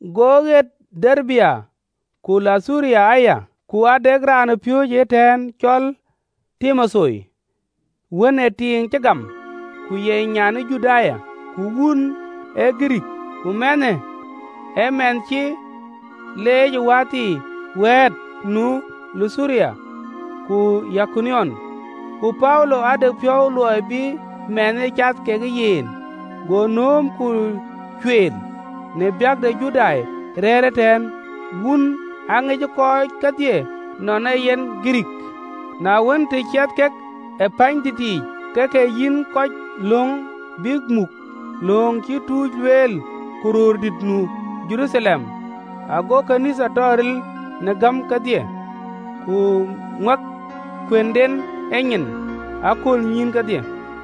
Go ɣet Derbe ku Luthura aya, ku ade raanpiööcë ëtɛ̈ɛ̈n, cɔl Timotheo, wën ë tiiŋ cï gam, ku ye nyan e Judai, ku wun ee Girikii. Ku mɛnhë ee mɛnh cï leec ë wäthii wɛ̈ɛ̈t nu Luthura ku Yikoniom. Ku Paulo ade piɔ̈u luɔi bï mɛnhë cath kekë yen, go nööm ku cueel, në biäk de Judai rɛ̈ɛ̈r ëtɛ̈ɛ̈n, wun aŋic kɔc kedhie nɔn ee yen Girikii. Na wën, të ciɛth kek ë pɛ̈ɛ̈nydït yiic, ke ke yïn kɔc lööŋ bïk muk, lööŋ cïï tuuc lueel ku röördït nu Jeruthalem. Ago ɣööt ke Nhialic tɔ ril në gäm kedhie, ku ŋuak kuënden e nyin ë aköölnyïïn kedhie.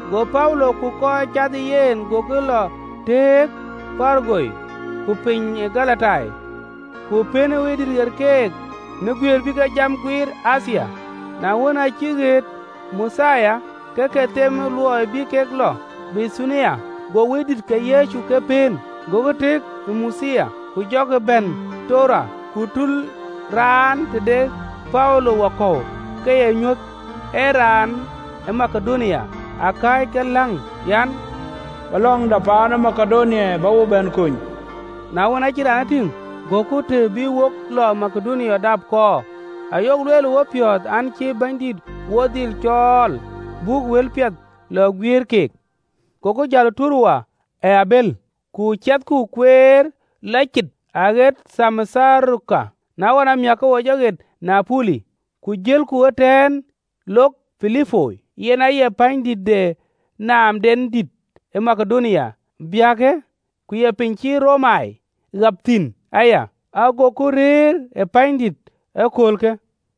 Go Paulo ku kɔc cath ë yen gokï lɔ tëëk Purugia ku piny ë Galatia, ku pën Wëidït ɣer keek në guiëër bï kek jam guiir në Athia. Na wën, aa cïk ɣet Muthia, ke ke them luɔi bï kek lɔ Bithunia, go Wëidït ke Yecu ke pëën. Gokï tëëk ë Muthia, ku jɔkï bɛ̈n Toroa. Ku tul raan tëde Paulo wakɔ̈u ke ee nyuöth, ee raan ë Makedonia akääc ke läŋ, an, “Bä lɔŋda paan ë Makedonia, bä wo bɛ̈n kony!” Na wën, aacï raanë tïŋ, goku të bï wo lɔ Makedonia dap kɔɔr, ayok lueel ë wopiɔ̈ɔ̈th an, cï Bɛ̈nydït wo dhil cɔɔl, buk wëlpiɛth lɔ guiëër keek. Goku jäl ë Toroa ë abël, ku ciɛthku kueer lɔ cït aɣet Thamotharake, na ɣɔn amiäk ke wo jɔ ɣet Niapoli. Ku jëlku, ëtɛ̈ɛ̈n lok Pilipoi, yen aye pänydït de naamdɛn dït ë Makedonia biäkë, ku ye piny cï Romai ɣap thïn aya, agoku rëër ë pänydïïtë aköölkë.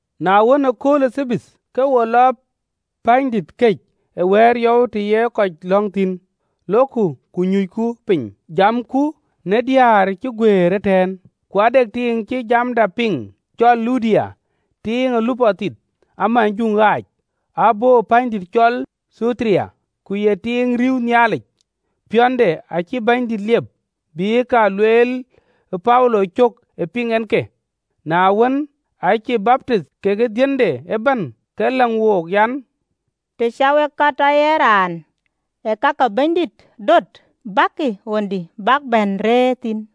Na wën, ëkööl ë Thabath, ke wo lɔ pänydït këc ë wɛ̈ɛ̈r yɔu të ye kɔc lɔ̈ŋ thïn, lokku ku nyucku piny, jamku në diëër cï guëër ëtɛ̈ɛ̈n. Ku ade tiiŋ cï jamda piŋ, cɔl Ludia, tiiŋ ee lupɔ thith amujuŋ ɣaac, abɔ̈ pänydït cɔl Thuatira, ku ye tiiŋ riëëu Nhialic, piɔ̈nde acïï Bɛ̈nydït liep, bï ka lueel Paulo cök ë piŋ en ke. Na wën, aacï baptith, kekë dhiënde ëbɛ̈n, ke läŋ wook an, “Të cä wek a tɔ ye raan ë ka ke Bɛ̈nydït döt, bäkï ɣöndï, bäk bɛ̈n rëër thïn.”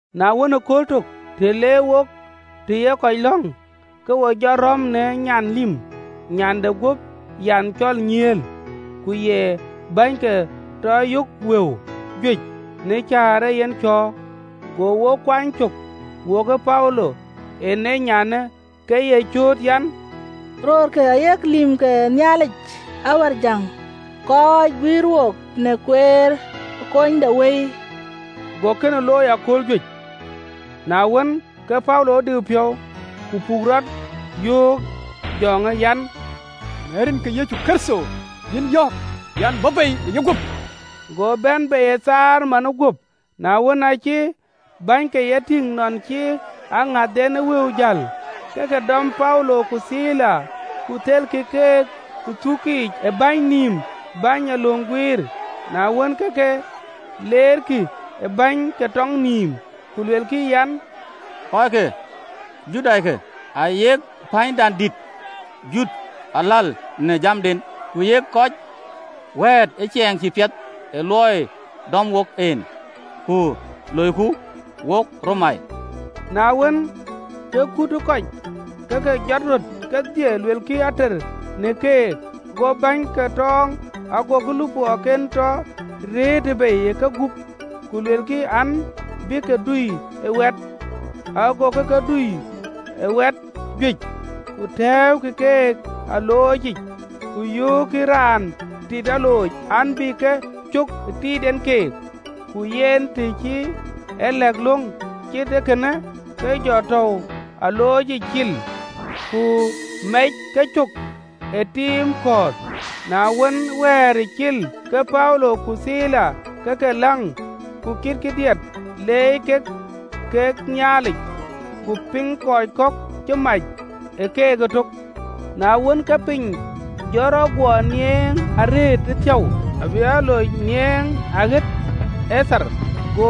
Na wën, ë kööl tök, të le wok të ye kɔc lɔ̈ŋ, ke wo jɔ rɔ̈m në nyan lïm, nyan de guöp yanh cɔl nyiëël, ku ye bänyke tɔ yök wëu juëc në cäär ee yen cɔ̈ɔ̈r. Go wo kuany cök wokë Paulo, en ee nyanë, ke ye cööt an, “Röörkë ayek lïïm ke Nhialic Awärjäŋ, kɔc guïïr wook në kueer ë kunydewëi!” Go kënë looi ë akööl juëc. Na wën, ke Paulo diu piɔ̈u, ku puk rɔt, yöök jɔŋë an, “Në rin ke Yecu Kërtho yïn yɔ̈ɔ̈k an, bä bei ë yeguöp.” Go bɛ̈n bei ë thaar manë guöp. Na wën, aacï bänyke e tïŋ nɔn cï aŋäthdɛn ë wëu jäl, ke ke dɔm Paulo ku Thila, ku thelkï keek ë thuukic ë bäny nïïm bäny ee löŋ guiir. Na wën, ke ke leerkï ë bäny ee löŋ guiir nïïm, ku luelkï an, “Kɔc ke Judaikë, ayek pänydandït jut aläl në jamden. Ku yek kɔc wɛ̈ɛ̈t ë ciɛɛŋ cïï piɛth ku wëët cuku duëër gam, ku loiku, wok Romai.” Na wën, ke kut ë kɔc ë ke jɔt röt kedhie luelkï ater në keek. Go bäny ee löŋ guiir lupɔɔken tɔ rëëtë bei ë kegup, ku luelkï an, abï ke dui ë wɛt. Agokï ke dui ë wɛt juëc, ku tɛ̈ɛ̈ukï keek ë aloocic, ku yöökkï raan tit alooc an, bï ke cök ë tiit en keek. Ku yen, të cï e lɛ̈k löŋ cït ee kënë, ke ke jɔ tääu aloocic cil, ku mɛc kecök në tiim kɔ̈ɔ̈th. Na wën, ë wɛ̈ɛ̈ric cil, ke Paulo ku Thila ke ke läŋ ku kitkï diɛt leec kek ke Nhialic, ku piŋ kɔc kɔ̈k cï mac ë keek ëtök. Na wën, ke piny jɔ rɔt guɔ niɛŋ arëët ëthiäu, abï alooc niɛŋ aɣet e thar. Go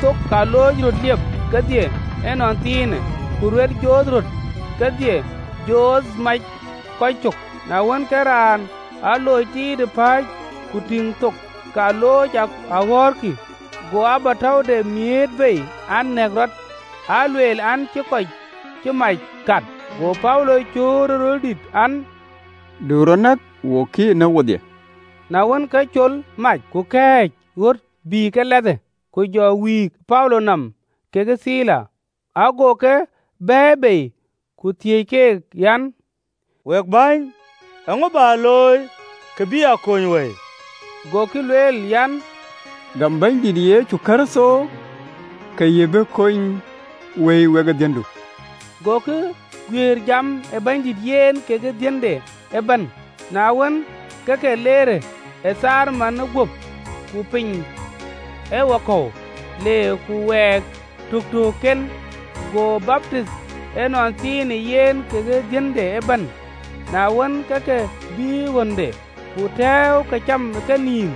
thook ke alooc röt liep kedhie ënɔnthiinë, ku ruet joth röt kedhie joth macë kɔc cök. Na wën, ke raan ë alooc tiit pääc, ku tïŋ thook ke alooc aɣɔ̈ɔ̈rkï, go abätäude miëët bei an, nɛ̈k rɔt, alueel an, cï kɔc mac kat. Go Paulo cööt ë röl dït an, “Du rɔt nɔ̈k, wok kï eenë, wedhie!” Na wën, ke cööl mac, ku kɛ̈ɛ̈c ɣöt, bï ke lɛthë, ku jɔ wïïk në Paulo nɔm kekë Thila. Ago ke bɛ̈ɛ̈i bei, ku thiëëc keek an, “Wek bäny, eeŋö bä looi, kë bï a kony wëi?” Gokï lueel an, “Gam Bɛ̈nydït Yecu Kërtho, ke yï bï kony wei, wekë dhiëndu.” Gokï guiëër jam ë Bɛ̈nydït, yen kekë dhiënde ëbɛ̈n. Na wën, ke ke leer ee thaar manë guöp, ku piny ee wakɔ̈u, le ku wɛɛk tëtöökken, go baptith ënɔnthiinë, yen kekë dhiënde ëbɛ̈n. Na wën, ke ke bïï ɣönde, ku tɛ̈ɛ̈u këcam ë kenïïm,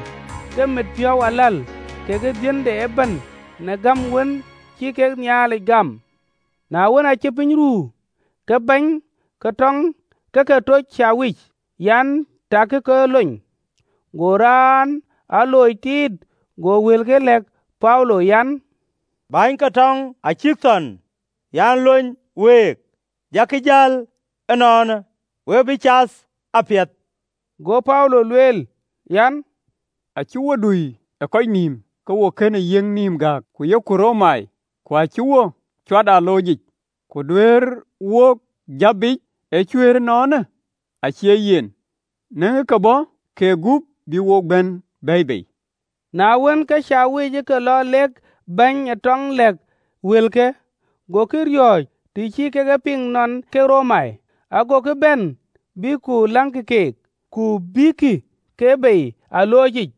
ke mit piɔ̈u aläl, kekë dhiënde ëbɛ̈n, në gäm wën cï kek Nhialic gam. Na wën, aacï piny ruu, ke bäny ee löŋ guiir ke ke toc bɛ̈ny de alooc an, “Takï kɔckë lony.” Go raan ë alooc tiit go wëlke lɛ̈k Paulo an, “Bäny ee löŋ guiir acïk thɔn an, lony week, jakï jäl ënɔɔnë, we bï cath apiɛth.” Go Paulo lueel an, “Acïk wo dui ë kɔc nïïm, ke wo kënë yiëk nïïm gääk, ku yok Romai, ku acïk wo cuat ë aloocic, ku duëërkï wook jäp biic ëcuëër ënɔɔnë? Acie yen, në ke bɔ̈ kegup, bïk wo bɛ̈n bɛ̈ɛ̈i bei.” Na wën, ke bäny ke alooc ë ke lɔ lek bäny ee löŋ guiir lɛ̈k wëlkë, gokï riɔ̈ɔ̈c, të cï kek e piŋ nɔn ee kek Romai. Agokï bɛ̈n, bïk ku läŋkï keek, ku bïïkï ke bei ë aloocic,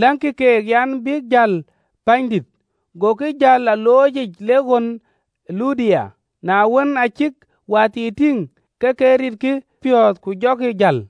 läŋkï keek an, bïk jäl pänydït. Gokï jäl ë aloocic, lek ɣön ë Ludia. Na wën, aa cïk wäthii tïŋ, ke ke ritkï piɔ̈ɔ̈th, ku jɔkï jäl.